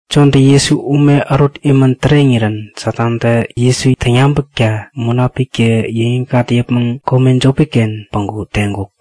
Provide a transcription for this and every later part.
Jontä Jesu ume ärut imän täreŋirän Satantä Jesu täŋyabäkta Munapiktä yäŋikŋat yäpmäŋ kome jopi-ken päŋku teŋkuk.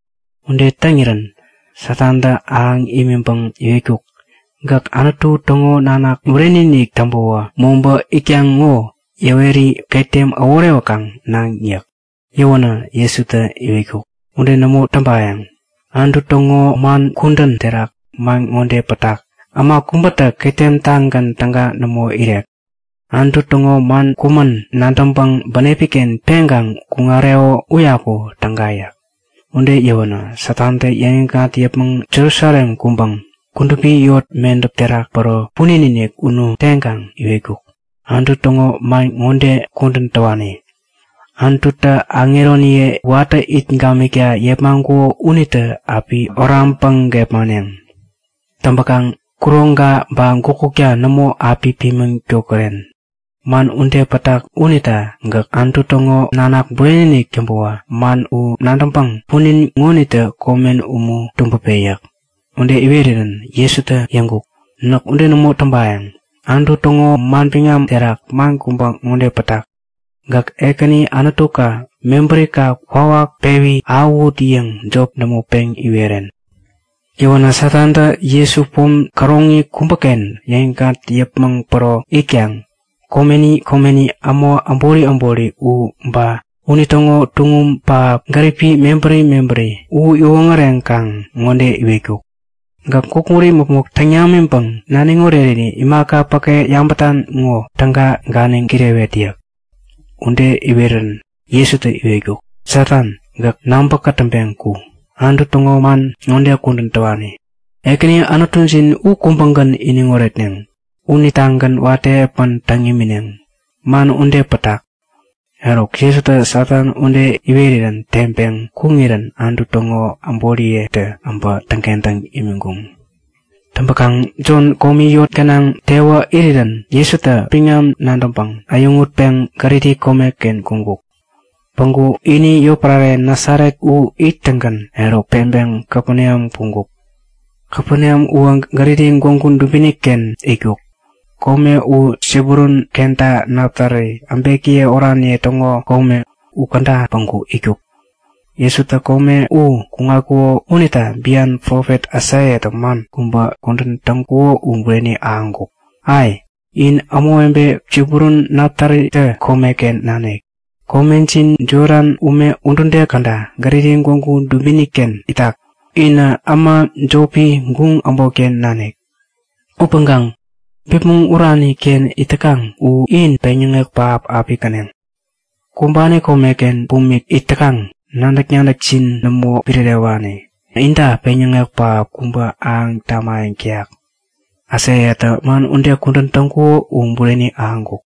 Ude täŋirän Satantä ahäŋ imiŋpäŋä iwetkuk; Gäk Anutu täŋo nanak bureni-inik täŋpäwä mobä itkaŋ ŋo yäweri ketem äworewäkaŋ naŋ yäk. Yäwänä Jesutä iwetkuk; Ude nämo täŋpayäŋ. Anutu täŋo man kudän terak man ŋode pätak; Äma kubätä ketem-tagän täga nämo irek. Anutu täŋo man kumän nadäŋpäŋ bänepi-ken peŋpäŋ kuŋareko uyaku täga yäk. Ude yäwänä Satantä yäŋikŋat yäpmäŋ Jerusalem kuŋpäŋ kudupi yot medäp terak päro punin-inik unu teŋkaŋ iwetkuk; Anutu täŋo man ŋode kudän täwani; Anututä aŋeroniye watä it gamikta yepmaŋkuko unitä api oraŋpäŋ gepmaneŋ. Täŋpäkaŋ kuroŋka ba gukutka nämo api pimiŋ tädoren. Man ude pätak unita gäk Anutu täŋo nanak bureni-inik täŋpäwä man u nadäŋpäŋ punin ŋonitä komen umu tubäpe! yäk. Ude iweränä Jesutä yäŋkuk; Näk ude nämo täŋpayäŋ. Anutu täŋo manbiŋam terak man kubä ŋode pätak; Gäk Ekäni Anutuka mebärika kwawak pewi ahäwut yäŋ jop nämo peŋ iweren yäk. Yäwänä Satantä Jesu pom käroŋi kubäken yäŋikŋat yäpmäŋ päro itkaŋ komeni komeni äma äbori äbori u ba unitäŋo tuŋum pähap gäripi mebäri mebäri u iwoŋäreŋkaŋ ŋode iwetkuk; Gäk gukut imäpmok täŋ namiŋpäŋ naniŋ oreriri imaka päke yabätan ŋowä täga ganiŋ kirewet yäk. Ude iweränä Jesutä iwetkuk; Satan, gäk nabä kätäŋpeŋ ku! Anutu täŋo man ŋode kudän täwani; Ekäni Anutujin u kubägän iniŋ oretneŋ. Unitagän watä epän täŋ imineŋ. Man ude pätak. Eruk Jesutä Satan ude iweränä teŋpeŋ kuŋirän Anutu täŋo aŋeroniyetä äbä täŋkentäŋ imiŋkuŋ. Täŋpäkaŋ Jon komi yot gänaŋ tewä irirän Jesutä biŋam nadäŋpäŋ äyäŋutpeŋ Galili komeken kuŋkuk. Päŋku ini yotpärare Nasaret u ittäŋgän eruk peŋpeŋ Kapeneam kuŋkuk. Kapeneam uwä Galili gwägu dubini-ken itkuk. Kome u Sebulun kenta Naptali äbekiye oraniye täŋo kome. Ukäda päŋku itkuk. Jesutä kome u kuŋatkuko unita bian profet Aisaiatä man ŋode kudän täŋkuko u bureni ahäŋkuk; Ai! In ämawebe Sebulun Naptalitä komeken nanik! Komejin Jodan ume udude käda Galili gwägu dubini-ken itak. Inä äma jopi, guŋ äbotken nanik. Upäŋkaŋ bipmäŋ urani-ken it täkaŋ u in peŋyäŋek pähap api käneŋ. Kumbani komeken bumik it täkaŋ, nadäk-nadäkjin nämo pirärewani, inta peŋyäŋek pähap kubä ahäŋ tamayäŋ täyak. Aisaiatä man ude kudän täŋkuko u bureni ahäŋkuk.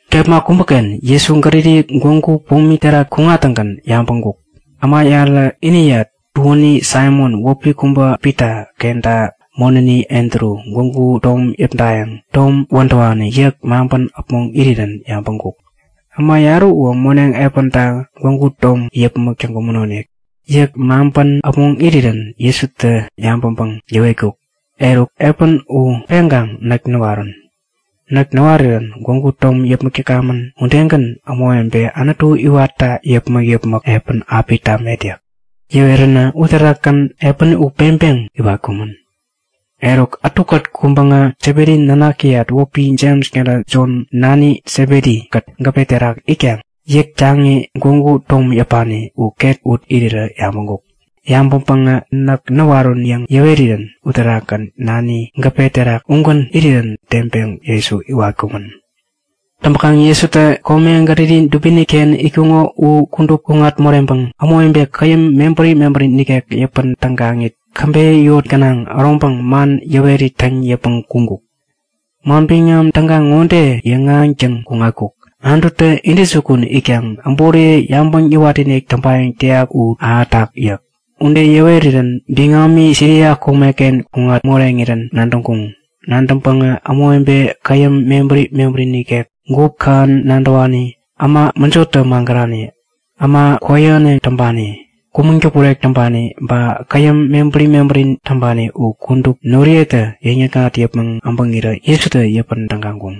Kepma kubäken Jesu Galili gwägu pomi terak kuŋattäŋgän yabäŋkuk; Äma yarä iniyat tuäni Saimon wäpi kubä Pita kenta monäni Andru gwägu tom yäpdayäŋ tom wädäwani yäk maŋpän äpmoŋirä yabäŋkuk. Äma yarä uwä moneŋ epänta gwägu tom yäpmäk täŋkumänonik. Yäk maŋpän äpmoŋ irirän Jesutä yabäŋpäŋ yäwetkuk; Eruk! Epän u peŋkaŋ näk näwarun! Näk näwarirän gwägu tom yäpmäk täkamän udegän ämawebe Anutu iwatta yäpmäk-yäpmäk epän api tamet yäk. Yäweränä uterakgän epäni u peŋpeŋ iwatkumän. Eruk, ätukät kuŋpäŋä Sebedi nanakiyat wäpi Jems kenta Jon nani Sebedi-kät gäpe terak itkaŋ yäk taŋi gwägu tom yäpani u ket ut irirä yabäŋkuk. Yabäŋpäŋä näk näwarun yäŋ yäwerirän uterakgän nani gäpe terak ugän irirän teŋpeŋ Jesu iwatkumän. Täŋpäŋ Jesutä kome Galili dubini-ken itkuŋo u kudup kuŋat moreŋpäŋ ämawebe käyäm mebäri mebäri nikek yäpän tägaŋit, käbeyä yot gänaŋ äroŋpäŋ man yäwerit täŋ yäpmäŋ kuŋkuk. Manbiŋam Täga ŋode yäŋahäŋtäŋ kuŋatkuk; Anututä intäjukun itkaŋ äboriye yabäŋ yäwatinik täŋpayäŋ täyak u ahätak yäk. Ude yäwerirän biŋami Siria komeken kuŋat moreŋirän nadäŋkuŋ. Nadäŋpäŋä ämawebe käyäm mebäri mebäri nikek, gup kähän nadäwani, äma mäjotä magärani, äma kwäyähäneŋ täŋpani, kumäŋ-däpurek täŋpani ba käyäm mebäri mebäri täŋpani u kudup noriyetä yäŋ-yäkŋat yäpmäŋ äbäŋirä Jesutä yäpän tägaŋkuŋ.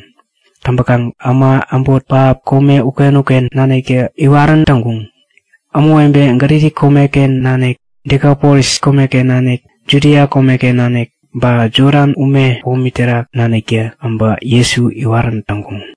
Täŋpänkaŋ äma äbot pähap kome uken-uken naniktä iwarän täŋkuŋ. Ämawebe Galili komeken nanik, Dekapolis komeken nanik, Judia komeken nanik, ba Jodan ume pomi terak naniktä äbä Jesu iwarän täŋkuŋ.